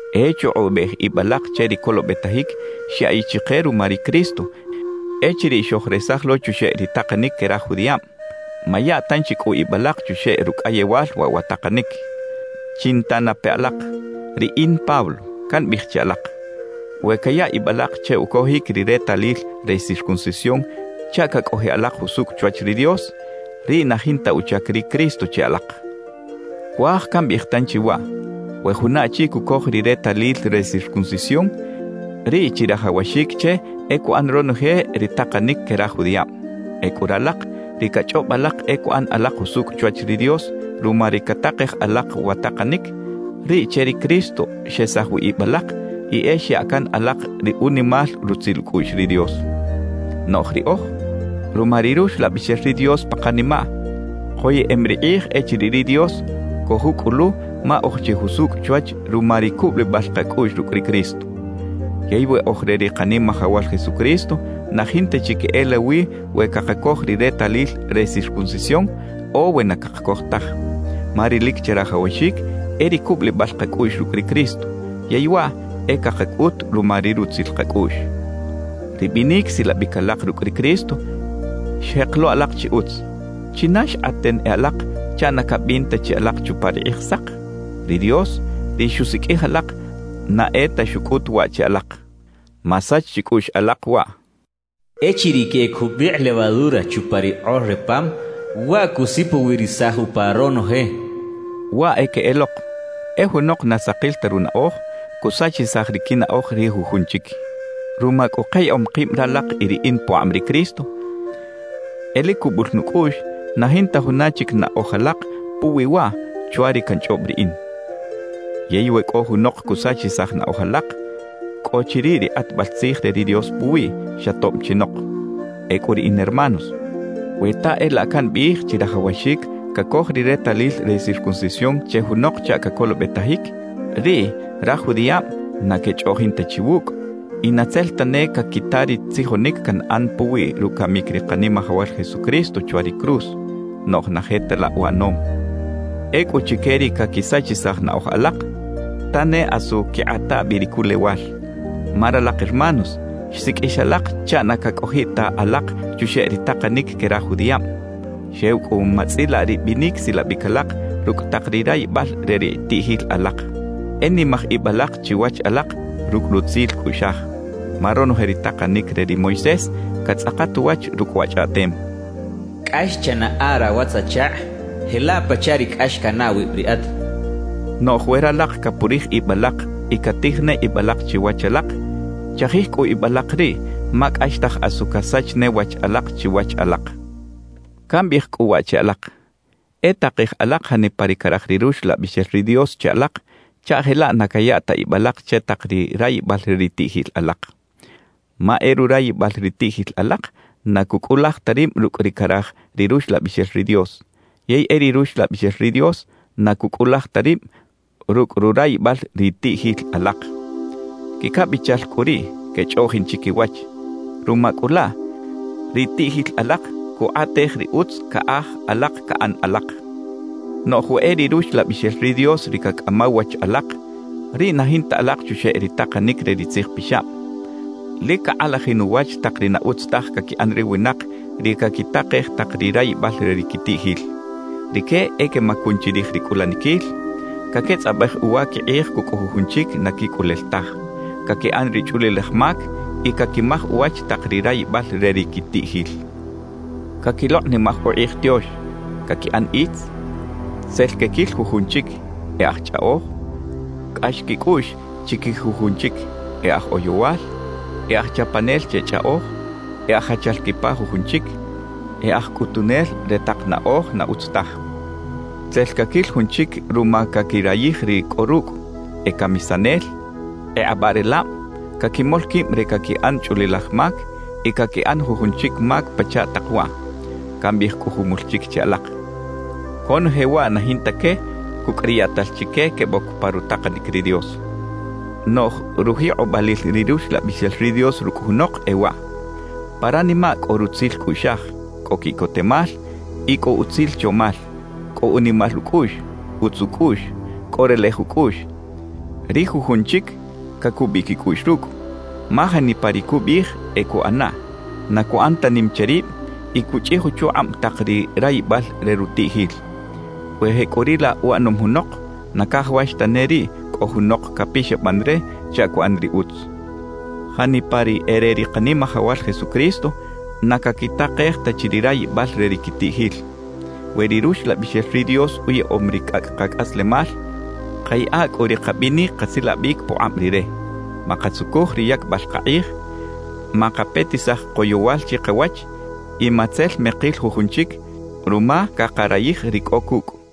E chukꞌubej ib alak che ri colobetajic xyaꞌiꞌ chike ruma ri Cristo echiriꞌ xojresaj lo chuxeꞌ ri takanic que raj judiꞌab; maya tanchi cꞌu ib alak chuxeꞌ rucꞌayewal waꞌ wa takanic. Chinta na pe alak. Riꞌin Pablo, cambiꞌij che alak: We caya ib alak che ucojic ri retalil re circuncisión chaꞌ cacꞌojiꞌ alak jusucꞌ chwach ri Dios, riꞌ na jinta uchac ri Cristo che alak. Cuaj cambiꞌij tanchi waꞌ: We juna achi cucoj ri retalil re circuncisión, riꞌ chirajawaxic che e cuꞌan ronoje ri takanic que raj judiꞌab. Ecꞌu ralak, ri cachꞌob alak e cuꞌan alak jusucꞌ chwach ri Dios ruma ri catakej alak wa takanic, riꞌ che ri Cristo xesaj wi ib alak y e xya can alak ri unimal rutzil ucꞌuꞌx ri Dios. Noꞌj riꞌoj, ruma ri Ruxlabixel ri Dios pa kanimaꞌ, koyeꞌem ri kꞌij echiriꞌ ri Dios cojucꞌulu ma oj chi jusucꞌ chwach ruma ri cubulibal kacꞌuꞌx rucꞌ ri Cristo. Yey we oj re ri Kanimajawal Jesucristo, na jinta chi queꞌelawi we cakacoj ri retalil re circuncisión o we na cakacoj taj. Ma ri lic chirajawaxic e ri cubulibal kacꞌuꞌx rucꞌ ri Cristo, yey waꞌ e cakacꞌut ruma ri rutzil kacꞌuꞌx. Ri binic silabic alak rucꞌ ri Cristo xjek lo alak chi utz. ¿China xkꞌaten e alak chaꞌ na cabin ta chi alak chupa ri Kꞌijsak? Ri Dios, ri xusiqꞌuij alak, na e ta xucꞌut waꞌ che alak. Masach chicꞌuꞌx alak waꞌ: «Echiriꞌ queꞌec jubikꞌ levadura chupa ri kꞌor re pam, waꞌ cusipowirisaj upa ronoje.» Waꞌ e queꞌelok: E junok na sakil ta runaꞌoj, cusachisaj ri quinaꞌoj ri jujun chic. Ruma cꞌu kayaꞌom kib ralak y riꞌin pukꞌab ri Cristo, e lic cubul nucꞌuꞌx na jinta juna chic naꞌoj alak puwi waꞌ chwa ri canchꞌob riꞌin. Yey we cꞌo junok cusachisaj naꞌoj alak, cꞌo chi riꞌ ri kꞌatbal tzij re ri Dios puwiꞌ, xa tob chinok. Ecꞌu riꞌin hermanos, we ta e laꞌ cambiꞌij chirajawaxic cacoj ri retalil re circuncisión che junok chaꞌ cacolobetajic, riꞌ raj judiꞌab na quechꞌoꞌjin ta chi wucꞌ y na tzel tane caquita ri tzijonic canꞌan puwi rucamic ri Kanimajawal Jesucristo chwa ri cruz. Noꞌj na je ta laꞌ uꞌanom. Ecꞌu chique ri caquisachisaj naꞌoj alak, ¡ta ne asu quikꞌata bi ri culewal! Ma ralak hermanos, xsiqꞌuix alak chaꞌ na cacꞌojiꞌ ta alak chuxeꞌ ri takanic que raj judiꞌab; xew cꞌu matzꞌilaꞌ ri binic silabic alak rucꞌ tak ri rayibal re ri tiꞌjil alak. E nimaj ib alak chiwach alak rucꞌ rutzil cꞌuꞌxaj. Ma ronoje ri takanic re ri Moisés catzꞌakat uwach rucꞌ wa chꞌaꞌtem: «Cꞌax chanaꞌa rawatz-achakꞌ jelaꞌ pachaꞌ ri cꞌax canaꞌ awib riꞌat» cachaꞌ. Noꞌj we ralak capurij ib alak y catij ne ib alak chiwach alak, chajij cꞌu ib alak riꞌ ma cꞌaxtaj asu casach ne wach alak chiwach alak. Cambiꞌij cꞌu waꞌ che alak: E takej alak janipa ri caraj ri Ruxlabixel ri Dios che alak chaꞌ jelaꞌ na caya ta ib alak che tak ri rayibal re ri tiꞌjil alak. Ma e rurayibal ri tiꞌjil alak na cucꞌulaj ta rib rucꞌ ri caraj ri Ruxlabixel ri Dios, yey e ri Ruxlabixel ri Dios na cucꞌulaj ta rib rucꞌ rurayibal ri tiꞌjil alak. Quicabichal cꞌu riꞌ quechꞌoꞌjin chiquiwach; ruma cꞌu laꞌ, ri tiꞌjil alak cukꞌatej ri utz caꞌaj alak caꞌan alak. Noꞌj we e ri Ruxlabixel ri Dios ri cacꞌamaw wach alak, riꞌ na jinta alak chuxeꞌ ri takanic re ri Tzij Pixab. Lic cakꞌalajin uwach tak ri na utz taj caquiꞌan ri winak ri caquitakej tak ri rayibal re ri quitiꞌjil. Rique e quemacun chirij ri cꞌulaniquil, caquetzꞌabej uwa quikꞌij cucꞌ jujun chic na quicꞌulel taj, caquiꞌan ri chꞌulilaj mac y caquimaj uwach tak ri rayibal re ri quitiꞌjil, caquilokꞌnimaj ukꞌij tiox, caquiꞌan itz, tzel quequil jujun chic, e aj chꞌaꞌoj, cꞌax quicꞌuꞌx chiquij jujun chic; e aj oyowal, e aj chapanel che chꞌaꞌoj, e aj jachal quipa jujun chic, e aj cꞌutunel re tak naꞌoj na utz taj tzel caquil jun chic ruma caquirayij ri cꞌo rucꞌ, e camisanel, e kꞌabaꞌrelab, caquimol quib re caquiꞌan chꞌulilaj mac y caquiꞌan jujun chic mac pachaꞌ tak waꞌ. Cambiꞌij cꞌu jumul chic che alak: Conoje waꞌ na jinta que cucꞌ ri yaꞌtal chique queboc pa rutakanic ri Dios. Noꞌj rujikꞌobalil ri Ruxlabixel ri Dios rucꞌ junok e waꞌ: pa ranimaꞌ cꞌo rutzil cꞌuꞌxaj, cꞌo quiꞌcotemal y cꞌo utzil chomal; cꞌo unimal ucꞌuꞌx, utz ucꞌuꞌx, cꞌo relej ucꞌuꞌx; ri jujun chic cacubiꞌ quicꞌuꞌx rucꞌ, ma janipa ri cubiꞌij, e cuꞌanaꞌ; na cuꞌan ta nim che rib y cuchꞌij uchukꞌab tak ri rayibal re rutiꞌjil. We jecꞌuriꞌlaꞌ uꞌanom junok, na cajawax tane riꞌ cꞌo junok capixaban re chaꞌ cuꞌan ri utz. Janipa ri e re ri Kanimajawal Jesucristo, na caquitakej ta chi ri rayibal re ri quitiꞌjil. We ri Ruxlabixel ri Dios uyaꞌom ri cꞌacꞌ kacꞌaslemal, kayaꞌa cꞌu ri kabinic kasilabic pukꞌab Rire. Makatzucuj ri yacbal kakꞌij, makapetisaj koyowal chikawach y matzel mekil jujun chic ruma cakarayij ri cꞌo cucꞌ.